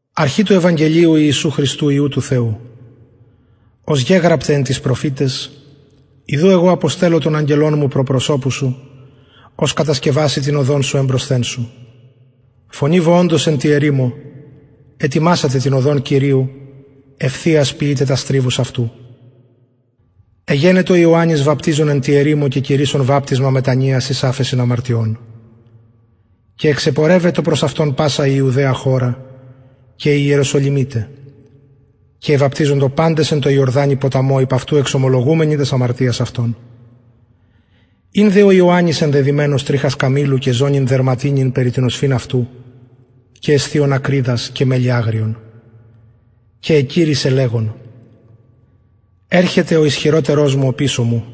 αρχη του ευαγγελιου ιησου χριστου υιου του θεου ως γεγραπται εν τοις προφηταις ιδου εγω αποστελλω τον αγγελον μου προ προσωπου σου ος κατασκευασει την οδον σου εμπροσθεν σου φωνη βοωντος εν τη ερημω ετοιμασατε την οδον κυριου ευθειας ποιειτε τας τριβους αυτου εγενετο ιωαννης βαπτιζων εν τη ερημω και κηρυσσων βαπτισμα μετανοιας εις αφεσιν αμαρτιων και εξεπορευετο προς αυτον πασα η ιουδαια χωρα και οι ιεροσολυμιται και εβαπτιζοντο παντες εν τω ιορδανη ποταμω υπ αυτου εξομολογουμενοι τας αμαρτιας αυτων ην δε ο ιωαννης ενδεδυμενος τριχας καμηλου και ζωνην δερματινην περι την οσφυν αυτου και εσθιων ακριδας και μελι αγριον και εκηρυσσεν λεγων ερχεται ο ισχυροτερος μου οπισω μου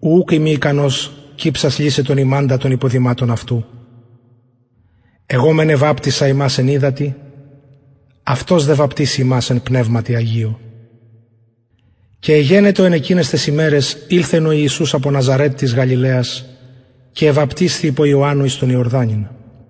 ου ουκ ειμι ικανος κυψας λυσαι τον ιμαντα των υποδηματων αυτου εγω μεν εβαπτισα υμας εν υδατι αυτος δε βαπτισει υμας εν πνευματι αγιω και εγενετο εν εκειναις ταις ημεραις ηλθεν ιησους απο ναζαρετ της γαλιλαιας και εβαπτισθη υπο ιωαννου εις τον ιορδανην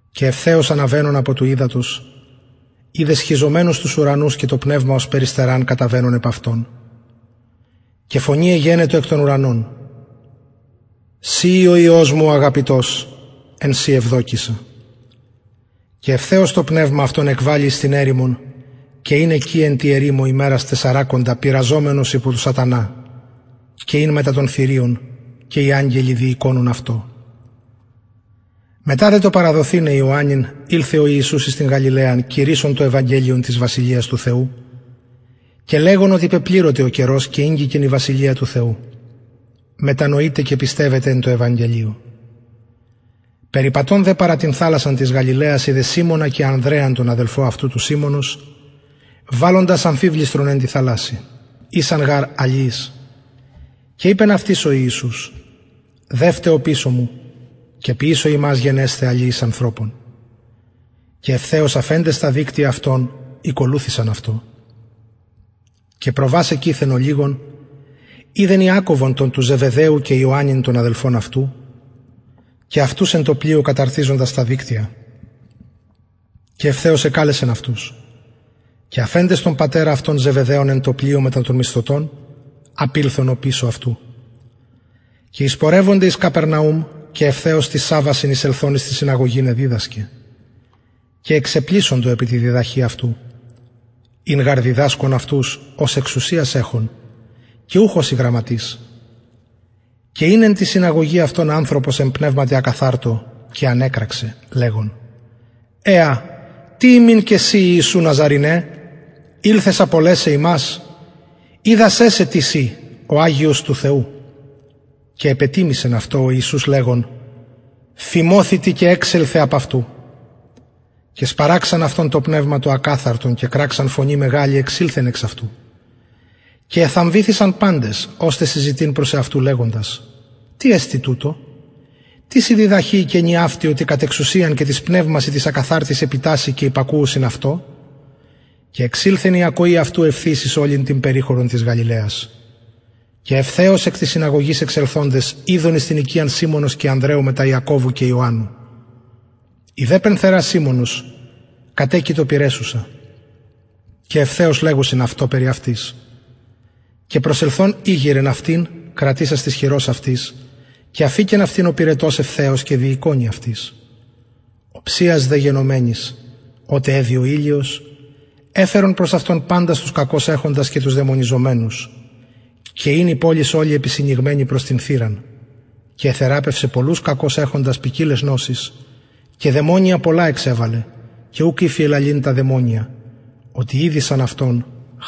και ευθεως αναβαινων απο του υδατος ειδεν σχιζομενους τους ουρανους και το πνευμα ωσει περιστεραν καταβαινον επ αυτον και φωνη εγενετο εκ των ουρανων συ ει ο υιος μου ο αγαπητος εν ω ευδοκησα και ευθυς το πνευμα αυτον εκβαλλει εις την ερημον και ην εκει εν τη ερημω ημερας τεσσαρακοντα πειραζομενος υπο του σατανα και ην μετα των θηριων και οι αγγελοι διηκονουν αυτω μετα δε το παραδοθηναι τον ιωαννην ηλθεν ο ιησους εις την γαλιλαιαν κηρυσσων το ευαγγελιον της βασιλειας του θεου και λεγων οτι πεπληρωται ο καιρος και ηγγικεν η βασιλεια του θεου μετανοειτε και πιστευετε εν τω ευαγγελιω περιπατων δε παρα την θαλασσαν της γαλιλαιας ειδεν σιμωνα και ανδρεαν τον αδελφον αυτου του σιμωνος βαλλοντας αμφιβληστρον εν τη θαλασση ησαν γαρ αλιεις και ειπεν αυτοις ο ιησους δευτε οπισω μου και ποιησω υμας γενεσθαι αλιεις ανθρωπων και ευθεως αφεντες τα δικτυα αυτων ηκολουθησαν αυτω και προβας εκειθεν ολιγον ειδεν ιακωβον τον του ζεβεδαιου και ιωαννην τον αδελφον αυτου και αυτους εν τω πλοιω καταρτιζοντας τα δικτυα και ευθεως εκαλεσεν αυτους και αφεντες τον πατερα αυτων ζεβεδαιον εν τω πλοιω μετα των μισθωτων απηλθον οπισω αυτου και εισπορευονται εις καπερναουμ και ευθεως τοις σαββασιν εισελθων εις την συναγωγην εδιδασκεν και εξεπλησσοντο επι τη διδαχη αυτου ην γαρ διδασκων αυτους ως εξουσιαν εχων και ουχ ως οι γραμματεις και ην εν τη συναγωγη αυτων ανθρωπος εν πνευματι ακαθαρτω και ανεκραξεν λεγων εα τι ημιν και σοι ιησου ναζαρηνε ηλθες απολεσαι ημας οιδα σε τις ει ο αγιος του θεου και επετιμησεν αυτω ο ιησους λεγων φιμωθητι και εξελθε εξ αυτου και σπαραξαν αυτον το πνευμα το ακαθαρτον και κραξαν φωνη μεγαλη εξηλθεν εξ αυτου και εθαμβηθησαν παντες ωστε συζητειν προς εαυτους λεγοντας τι εστιν τουτο τις η διδαχη η καινη αυτη οτι κατ εξουσιαν και τοις πνευμασιν τοις ακαθαρτοις επιτασσει και υπακουουσιν αυτω εξηλθεν δε η ακοη αυτου ευθυς εις ολην την περιχωρον της γαλιλαιας και ευθεως εκ της συναγωγης εξελθοντες ηλθον εις την οικιαν σιμωνος και ανδρεου μετα ιακωβου και ιωαννου η δε πενθερα σιμωνος κατεκειτο πυρεσσουσα και ευθεως λεγουσιν αυτω περι αυτης και προσελθων ηγειρεν αυτην κρατησας της χειρος αυτης και αφηκεν αυτην ο πυρετος ευθεως και διηκονει αυτοις οψιας δε γενομενης οτε εδυ ο ηλιος εφερον προς αυτον παντας τους κακως εχοντας και τους δαιμονιζομενους και η πολις ολη επισυνηγμενη ην προς την θυραν και εθεραπευσεν πολλους κακως εχοντας ποικιλαις νοσοις και δαιμονια πολλα εξεβαλεν και ουκ ηφιεν λαλειν τα δαιμονια οτι ηδεισαν αυτον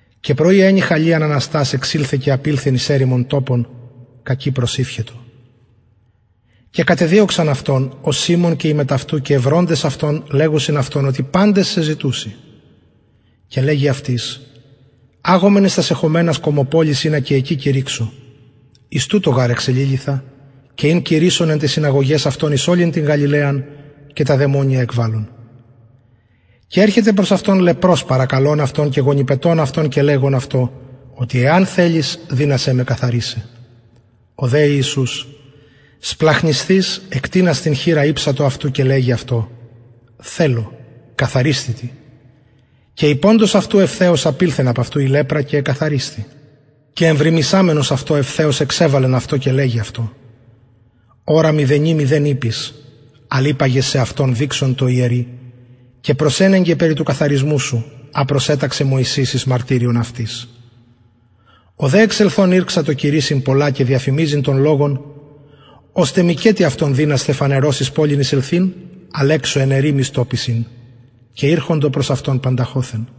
και πρωι εννυχον λιαν αναστας εξηλθεν και απηλθεν εις ερημον τοπον κακει προσηυχετο και κατεδιωξαν αυτον ο σιμων και οι μετ αυτου και ευροντες αυτον λεγουσιν αυτω οτι παντες σε ζητουσιν και λεγει αυτοις αγωμεν εις τας εχομενας κωμοπολεις ινα και εκει κηρυξω εις τουτο γαρ εξεληλυθα και ην κηρυσσων εν ταις συναγωγαις αυτων εις ολην την γαλιλαιαν και τα δαιμονια εκβαλλων και ερχεται προς αυτον λεπρος παρακαλων αυτον και γονυπετων αυτον και λεγων αυτω οτι εαν θελης δυνασαι με καθαρισαι ο δε ιησους σπλαγχνισθεις εκτεινας την χειρα ηψατο αυτου και λεγει αυτω θελω καθαρισθητι και ειποντος αυτου ευθεως απηλθεν απ αυτου η λεπρα και εκαθαρισθη και εμβριμησαμενος αυτω ευθεως εξεβαλεν αυτον και λεγει αυτω ορα μηδενι μηδεν ειπης αλλ υπαγε σεαυτον δειξον τω ιερει και προσενεγκε περι του καθαρισμου σου α προσεταξεν μωσης εις μαρτυριον αυτοις ο δε εξελθων ηρξατο κηρυσσειν πολλα και διαφημιζειν τον λογον ωστε μηκετι αυτον δυνασθαι φανερως εις πολιν εισελθειν αλλ εξω εν ερημοις τοποις ην και ηρχοντο προς αυτον πανταχοθεν